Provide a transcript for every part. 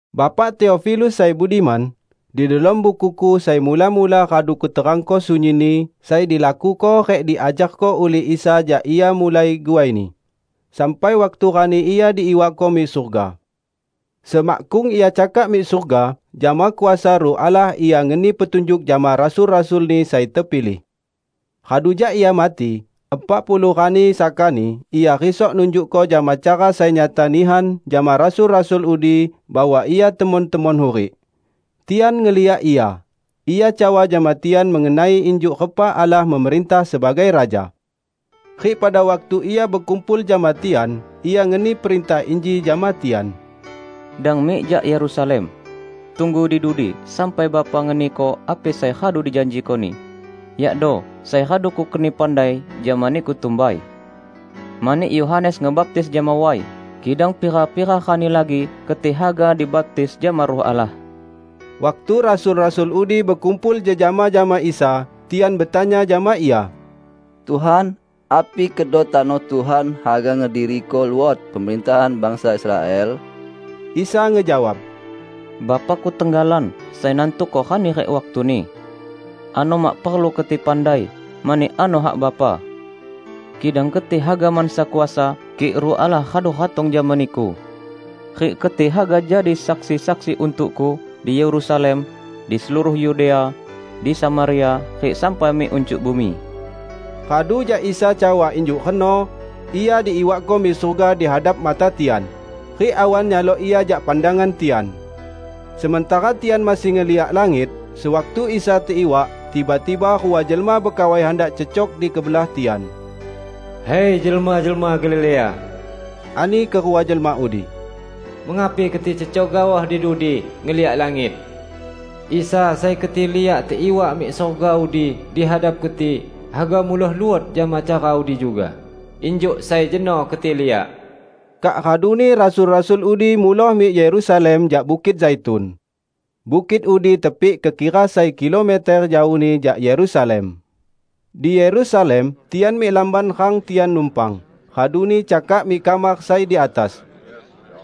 Bapak Teofilus sai budiman, Di delom bukuku sai mula-mula radu kuterangko sunyinni sai dilakuko rik diajarko ulih Isa jak Ia mulai guai-Ni, sampai waktu rani Ia diiwakko mik surga. Semakkung Ia cakak mik surga, jama kuasa Ruh Allah Ia ngeni petunjuk jama rasul-rasul-Ni sai tepilih. Radu jak Ia mati, epak puluh rani sakani Ia risok nunjukko jama cara sai nyata nihan jama rasul-rasul udi bahwa Ia temon-temon hurik. Tian ngeliak Ia, Ia cawa jama tian mengenai injuk repa Allah memerintah sebagai Raja. Rik pada waktu Ia bekumpul jama tian, Ia ngeni perintah inji jama tian, "Dang mik jak Yerusalem. Tunggu di dudi sampai Bapa ngeniko api sai radu dijanjiko-Ni, yakdo sai radu Kukeni pandai jama niku tumbai. Mani Yohanes ngebaptis jama way, kidang pira-pira rani lagi keti haga dibaptis jama Ruh Allah." Waktu rasul-rasul udi bekumpul jejama jama Isa, tian betanya jama Ia, "Tuhan, api kedo tano Tuhan haga ngediriko luot pemerintahan bangsa Israel?" Isa ngejawab, "Bapa-Ku tenggalan sai nantuko rani rik waktuni. Ano mak perlu keti pandai, mani ano hak Bapa. Kidang keti haga mansa kuasa, kik Ruh Allah radu ratong jama niku. Rik keti haga jadi saksi-saksi untuk-Ku di Yerusalem, di seluruh Yudea, di Samaria, rik sampai mik uncuk bumi." Radu jak Isa cawa injuk reno, Ia diiwakko mik surga di hadap mata tian, rik awan nyalok Ia jak pandangan tian. Sementara tian masih ngeliak langit, sewaktu Isa teiwak, tiba-tiba rua jelma bekawai handak cecok di kebelah tian. "Hai, jelma-jelma Galilea," ani kerua jelma udi, "mengapi keti cecok gaoh di dudi ngeliak langit? Isa, sai keti liak teiwak mik surga udi di hadap keti, haga muloh luot jama cara udi juga, injuk sai jeno keti liak." Kak raduni rasul-rasul udi muloh mik Yerusalem jak Bukit Zaitun. Bukit udi tepik kekira sai kilometer jaohni jak Yerusalem. Di Yerusalem tian mik lamban rang tian numpang, raduni cakak mik kamar sai di atas.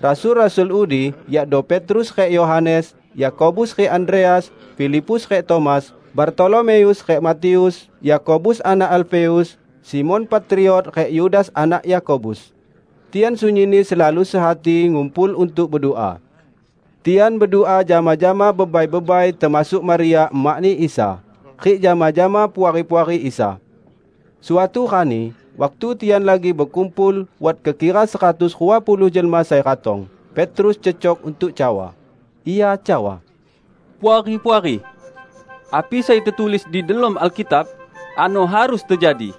Rasul-rasul udi, yakdo Petrus rik Yohanes, Yakobus rik Andreas, Filipus rik Tomas, Bartolomeus rik Matius, Yakobus anak Alfeus, Simon Patriot rik Yudas anak Yakobus; tian sunyinni selalu sehati ngumpul untuk bedua. Tian bedua jama-jama bebai-bebai termasuk Maria emakni Isa, rik jama-jama puari-puari Isa. Suatu rani, waktu tian lagi bekumpul -- wat kekira seratus rua puluh jelma sai ratong -- Petrus cecok untuk cawa. Ia cawa, "Puari-puari! Api sai tetulis di delom Alkitab, ano harus tejadi.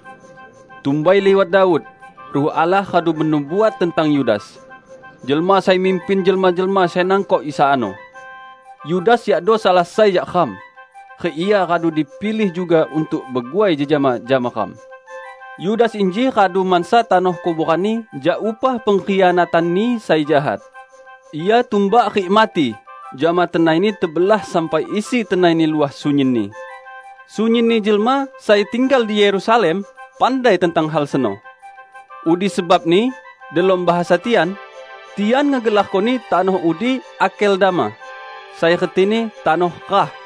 Tumbai liwat Daud, Ruh Allah radu benubuat tentang Yudas, jelma sai mimpin jelma-jelma sai nangkok Isa ano. Yudas yakdo salah sai jak ram, rik ia radu dipilih juga untuk beguai jejama jama ram." ( Yudas inji radu mansa tanoh kuboranni jak upah pengkhianatanni sai jahat. Ia tumbak rik mati jama tenaini tebelah sampai isi tenaini luah sunyinni. Sunyinni jelma sai tinggal di Yerusalem pandai tentang hal seno. Udi sebabni delom bahasa tian, tian ngegelarkoni tanoh udi Akeldama, sai retini 'Tanoh Rah'.)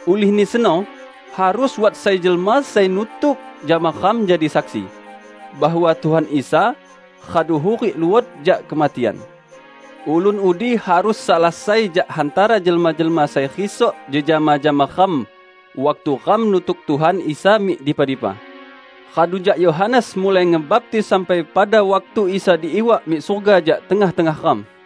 Ulihni seno, harus wat sai jelma sai nutuk jama ram jadi saksi bahwa Tuhan Isa radu hurik luot jak kematian. Ulun udi harus salah sai jak hantara jelma-jelma sai risok jejama jama ram waktu ram nutuk Tuhan Isa mik dipa-dipa, radu jak Yohanes mulai ngebaptis sampai pada waktu Isa diiwak mik surga jak tengah-tengah ram."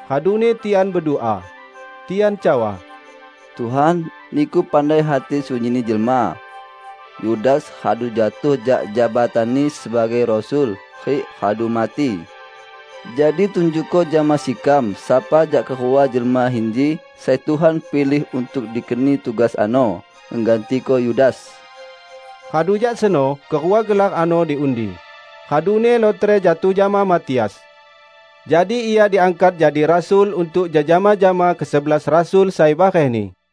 Raduni tian bedua. Tian cawa, "Tuhan, Niku pandai hati sunyinni jelma. Yudas radu jatuh jak jabatanni sebagai rasul rik radu mati. Jadi tunjukko jama sekam, sapa jak kerua jelma inji sai Tuhan pilih untuk dikeni tugas ano ngegantiko Yudas." Radu jak seno kerua gelar ano diundi, raduni lotre jatuh jama Matias. Jadi ia diangkat jadi rasul untuk jejama jama kesebelas Rasul sai barehni.